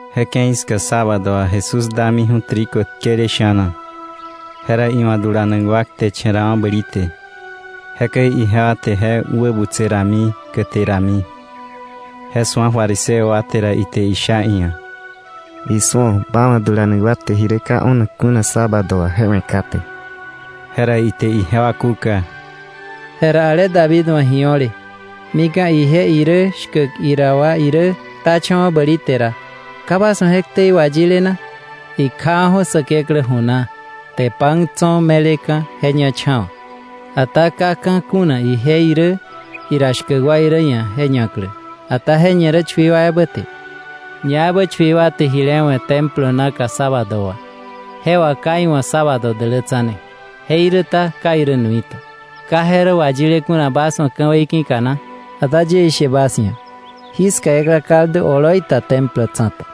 Je ke̱i ska sábado wà Jesús damiju̱ trigo tkele sha̱na, jera iwa̱ dulanak wa kteche̱rawa̱ bäli te. Jekäi ijewa te je wä butse rami, käte rami. Je su̱a fariseo wa te ra, ite isha iia̱: —Isu̱o, ba wa̱ dulanak wa te ji rä ka o̱nak kuna sábado wà je we̱ kate. Jera ite ijewa kúka: —Jera ale David wa̱ ji o̱le, mika̱ ije irä shkäk ira wa irä ktacha̱wa̱ bäli te ra, ¿ka bas wa̱ je ktei wayile na? Ikjawa̱ju̱ Säkeklä ju na, te pan tso̱ me̱leka̱ je ñacha̱wa̱. Ata ka ka̱ kuna ije irä, ira shkäk wa irä ia̱ je ñaklä, ata je ñe rä chui wa ebä te. Ñaebä chui wa te jile we̱ Templo naka sábado wà, je wà ka iwa̱ sábado dälätsane, jeiräta ka irä nuita, ¿ka je rä wayile kuna bas wa̱ ka̱wei ki̱ka na? Ata yie ishe bas ia̱, jiska ekla kaldu Templo tsa̱ta.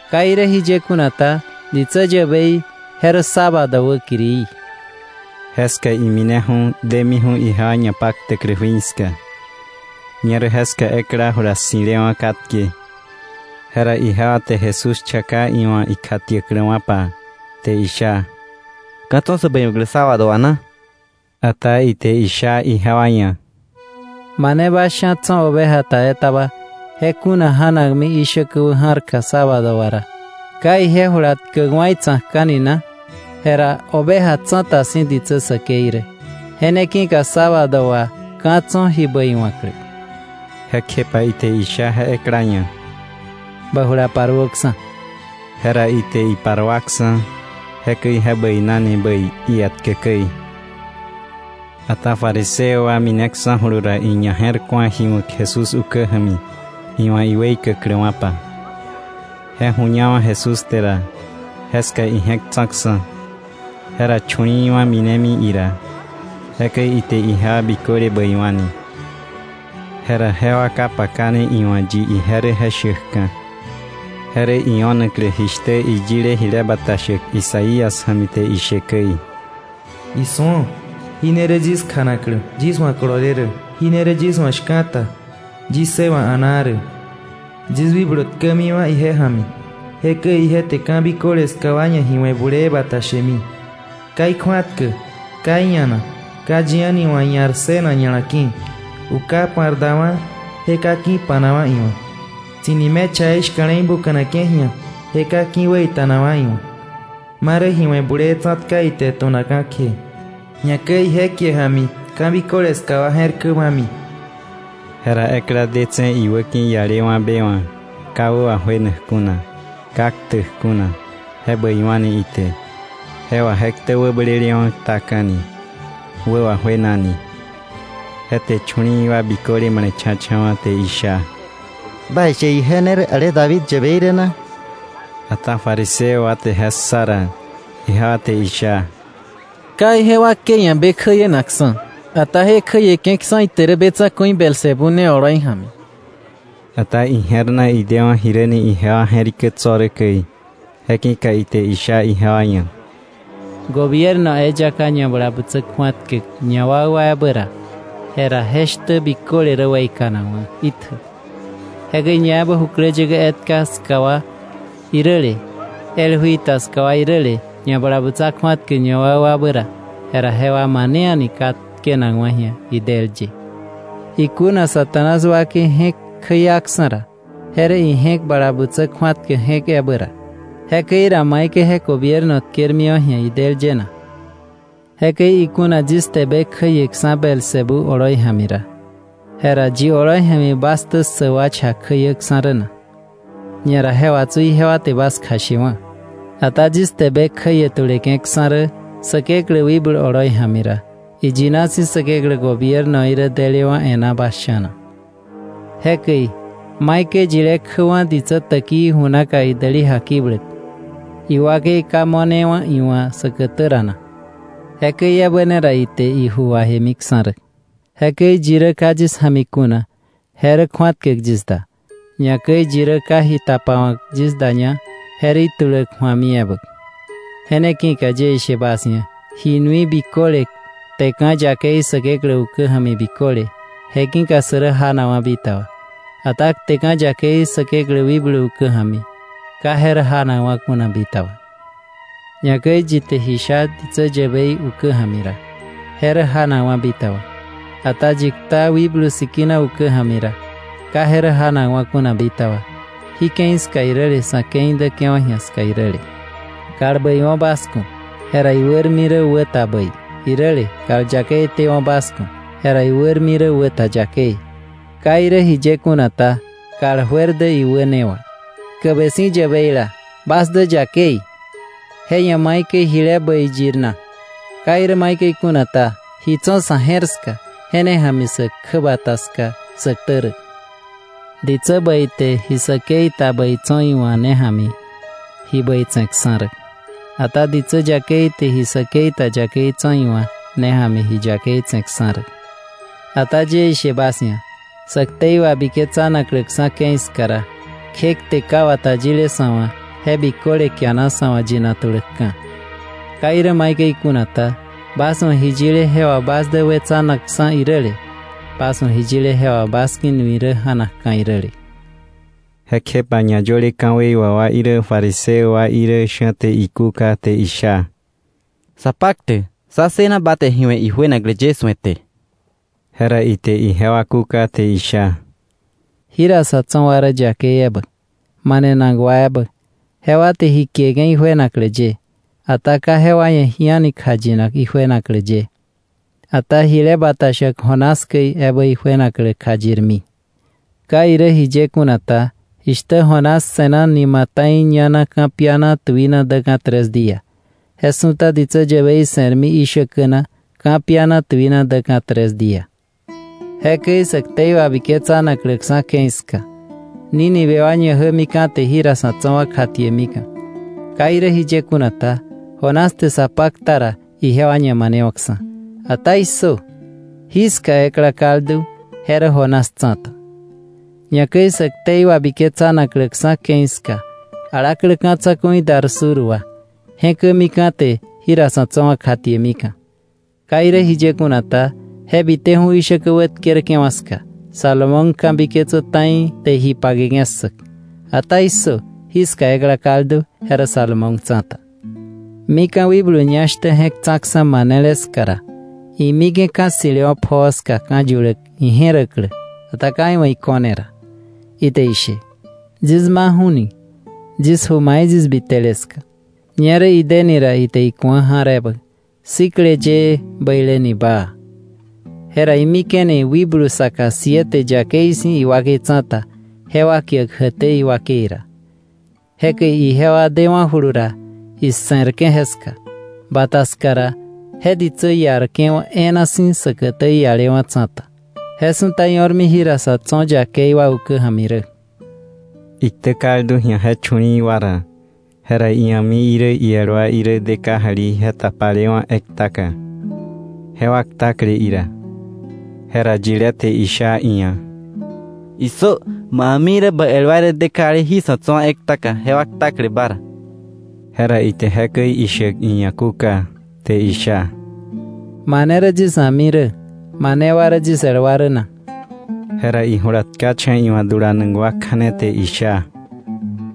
Ka irä jiye kuna ta, ditsä yäbei, je rä sábado wäkirií. Jeska imineju̱ demiju̱ ijewa ñapaktäklä jui ska. Ñerä jeska ekla jula ssi̱lewa̱ katke. Jera ijewa te Jesús chaka iwa̱ ikjatiäkläwa̱pa, te isha: —¿Ka̱ tso̱ sä bäiwa̱klä sábado wà na? Ata ite isha ijewa ia̱: —Mane bas sha̱ tso̱ oveja ta etaba, je kuna ja̱nakmi ishäkä wä ja̱rka sábado wà ra, ¿ka ije jula tkäkwa̱ itsa̱kka̱ni na? Jera oveja tsa̱ta si̱ ditsä säkei rä. Je ne ki̱ka sábado wà ka̱ tso̱ ji bäiwa̱klä. Jekjepa ite isha je ekla ia̱: —Bä jula paruöksa̱. Jera ite iparuaksa̱, jekäi je bäinani bäi ietkä käi. Ata fariseo wa mineksa̱julu ra, iñaje̱rku̱a ji wa̱k Jesús ukä ja̱mi iwa̱ iweikäkläwa̱pa. Je ju̱ñawa̱ Jesús te ra, jeska ije̱k tsa̱ksa̱. Jera chu̱li̱i̱wa̱ minemi ira, jekäi ite ijewa biköle bäiwa̱ni. Jera jewa ka pakane iwa̱ yi ije rä je shäkka̱. Je rä io̱naklä jishtä iyile jile bata shäk Isaías ja̱mi te ishe käi: “Isu̱o, jí ne rä yis kjanaklä, yis wa̱ kolole rä, jí ne rä yis wa̱ shka̱ta, yis ssëwa̱k a̱naa rä. Yis wikblu tkämiwa̱ ije ja̱mi, jekäi ije te ka̱ biköle ska wa ia̱ ji we̱ bulee bata shemi. Ka ikju̱atkäk, ka ia̱nak; ka yi a̱ni wa̱ ia̱r ssënak ña̱la ki̱. Uka pa̱r dawa̱, je ka ki̱ pa̱nakwa̱ iwa̱. Tsi̱ni mechaí shka̱le̱i buka̱nake̱ ji̱a, je ka ki̱ wäita̱nakwa̱ iwa̱, marä ji we̱ bulee tsa̱tka ite tu̱nakka̱ kje, ñakäi ije kie ja̱mi ka̱ biköle ska wa je̱r blämi.” Jera ekla detse̱ iwäki̱ ialewa̱ be wa̱ ka wä wajuenak kuna, ka ktäk kuna, je bäiwa̱ni ite; je wà je ktä wäblelewa̱ ktaka̱ni, wä wajuenani. Je te chu̱li̱i̱ wa biköle male̱cha̱cha̱wa̱, te isha: “¿Baishe ije ne rä ale David yäbei rä na?” Ata fariseo wa te je ssa ra, ijewa te isha: “Ka ije wakei ia̱ be kjäienakksa̱, ata je kjäieke̱ksa̱ ite rä be tsa̱ku̱i Beelzebú ne oloi ja̱mi.” Ata ije̱r na idewa̱ jiräni ijewa je̱rikä tso̱ rä käi, je ki̱ka ite isha ijewa ia̱: “Gobierno eyaka ñabalabutsa kju̱atkäk ñawakwabä ra, jera je shtä biköle rä weikanakwa̱ itjä. Jekäi ñaebä jukläyäkä etka ska wa iräle, el jui ta ska wa iräle, ñabalabutsa kju̱atkäk ñawakwabä ra, jera jewa mane a̱ni ka tkenakwa̱ ji̱a idël ye. Ikuna Satanás wakei je̱k kjäiaksa̱ ra, je rä ije̱k bala butsä kju̱atkäk je̱k ebä ra. Jekäi ra, ¿maikäi je gobierno tke̱rmiwa̱ ji̱a idël ye na? Jekäi ikuna yis te be kjäieksa̱ Beelzebú oloi ja̱mi ra, jera ¿yi oloi ja̱mi bas ktä ssäk wa cha kjäiäksa̱ rä na? Ñera je wà tsu ijewa te bas kjashewa̱. Ata yis te be kjäie tuleke̱ksa̱ rä Säkeklä wikblu oloi ja̱mi ra, iyina si̱ Säkeklä gobiernoí rä delewa̱ e̱ná bas sha̱na. “Jekäi, ¿maikäi yile kjäwa̱ ditsä täkii ju naka idäli jakibläk, iwakei ka mo̱ne iwa̱ säkätä ra na? Jekäi ebä ne ra ite iju wajemiksa̱ rä. “Jekäi yi rä ka yis ja̱mi kuna, je rä kju̱atkäk yis da; ñakäi yi rä ka ji tapawa̱k yis daña, je rä ituläk ju̱ami ebä. “Je ne ki̱ka yie ishe bas ia̱: ji nui biköle, kteka̱ yakei Säkeklä ukä ja̱mi biköle, je ki̱ka sä rä janakwa̱ bitaba, ata kteka̱ yakei Säkeklä Wikblu ukä ja̱mi ka je rä janakwa̱ kuna bitaba. Ñakäi yi te ji sha ditsä yäbei ukä ja̱mi ra, je rä janakwa̱ bitaba, ata yi kta Wikblu Sikina ukä ja̱mi ra, ka je rä janakwa̱ kuna bitaba, jí ke̱i ska iräle, sa̱ ke̱i däke̱wa̱ ji̱a ska iräle. “Kal bäiwo̱ bas ku̱, jera iwärmi rä wä ta bäi; iräle, kal yakei tewo̱ bas ku̱, jera iwärmi rä wä ta yakei. Ka irä jiye kuna ta, kal juer dä iwä ne wà. Tkäbe si̱ yäbeila, bas dä yakei, ¿je ia̱ maikäi jile bäi yir na? Ka irä maikäi kuna ta, ji tso̱ sa̱ je̱r ska je ne ja̱mi sä kjäbata ska sä ktä rä. Ditsä bäi te ji säkei ta bäi tso̱ iwa̱ ne ja̱mi ji bäi tse̱ksa̱ rä, ata ditsä yakei te ji säkei ta yakei tso̱ iwa̱ ne ja̱mi ji yakei tse̱ksa̱ rä. Ata yie ishe bas ia̱, sä ktei wabiketsanakläksa̱ ke̱i ska ra, kje kte ka wata yile sa̱ wa̱ je biköle kiana sa̱ wa̱ yinak tuläkka̱. Ka irä maikäi kuna ta, bas wa̱ ji yile, jewa bas dä wetsanakksa̱ iräle; bas wa̱ ji yile, jewa bas ki̱ nui rä ja̱nakka̱ iräle.” Jekjepa ñayöle ka̱wei wà wa irä fariseo wa irä sha̱ te ikúka te isha: —Sapaktäk, sá ssëna ba te ji we̱ ijuenaklä ye su̱ete. Jera ite ijewa kúka te isha: —Jira sa̱ tso̱ wa rä yakeila ebä, manenak wa ebä; jewa te ji kieke̱ ijuenaklä ye. Ata ka jewa ia̱ ji a̱ni kjayinak ijuenaklä ye, ata jile bata shäk Jonás käi ebä ijuenaklä kjayirmi. Ka irä jiye kuna ta, jishtä Jonás se̱na nima ta̱i ña na ka̱piana tuina däka̱ tres día, je su̱ta ditsä yäbei se̱rmi ishäkä na ka̱piana tuina däka̱ tres día. Jekäi sä ktei wabiketsanakläksa̱ ke̱i ska, Nínive wa ñajämika̱ te jira sa̱ tso̱ wa kjatiemika̱. Ka irä jiye kuna ta, Jonás te sa pakta ra ijewa ñamanewa̱ksa̱. Ata ¡issö! Jiska ekla kaldu, je rä Jonás tsa̱ta. Ñakäi sä ktei wabiketsanakläksa̱ ke̱i ska alaklä ka̱ tsa̱ku̱i dar sur wa, je̱kämika̱ te jira sa̱ tso̱ wa kjatiemika̱. Ka irä jiye kuna ta, je biteju̱ ishäkä wätkerke̱wa̱ ska Salomón ka̱biketsäk ta̱i te ji pake ssäk. Ata ¡issö! Jiska ekla kaldu, je rä Salomón tsa̱ta. “Mika̱ wikblu ñá shtä je̱k tsa̱ksa̱ manele ska ra, imike̱ ka̱ ssi̱lewa̱ pjoo ska ka̱ yuläk ije̱räklä, ata ka iwa̱ iko̱ne ra, ite ishe: ‘Yis maju̱ni yis ju mai yis bitele ska.’ Ñerä ideni ra, ite iku̱a ja̱r ebä, sikle yëë, bäileni baa. Jera imike̱ni wikblu saka siete yakei si̱ iwakei tsa̱ta, jewa kiäk jäkté iwakei ra. Jekäi ijewa dewa̱julu ra, ise̱rke̱ jeska; bata ska ra je ditsä iarke̱wa̱ e̱e̱na si̱ säkätä iialewa̱ tsa̱ta. Je su̱ta io̱rmi jira sa̱ tso̱ yakei wa ukä ja̱mi rä.” Iktä kaldu ji̱a je chu̱li̱i̱ wa ra, jera ia̱mi irä iel wa irä de kajali je tapalewa̱ ektaka, jewa ktakle ira. Jera yilé te isha iia̱: —¡Issö! Ma a̱mi irä bä el wa irä de kajali jí sa̱ tso̱ wa ektaka, jewa ktakle ba ra. Jera ite jekäi ishäk iia̱ kúka, te isha: —¿Mane rä yis a̱mi rä, mane wa rä yis el wa rä na? Jera ijula tkacha̱ iwa̱ dulanak wa kja̱ne te isha: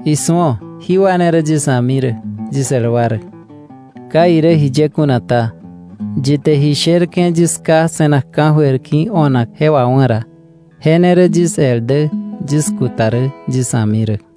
—¡Isu̱o! Jí wa ne rä yis a̱mi rä, yis el wa rä. Ka irä jiye kuna ta, yi te ji sherke̱ yis Ká se̱nak ka̱jöir ki̱ o̱nak je wawá̱ ra, je ne rä yis el dä, yis kuta rä, yis a̱mi rä.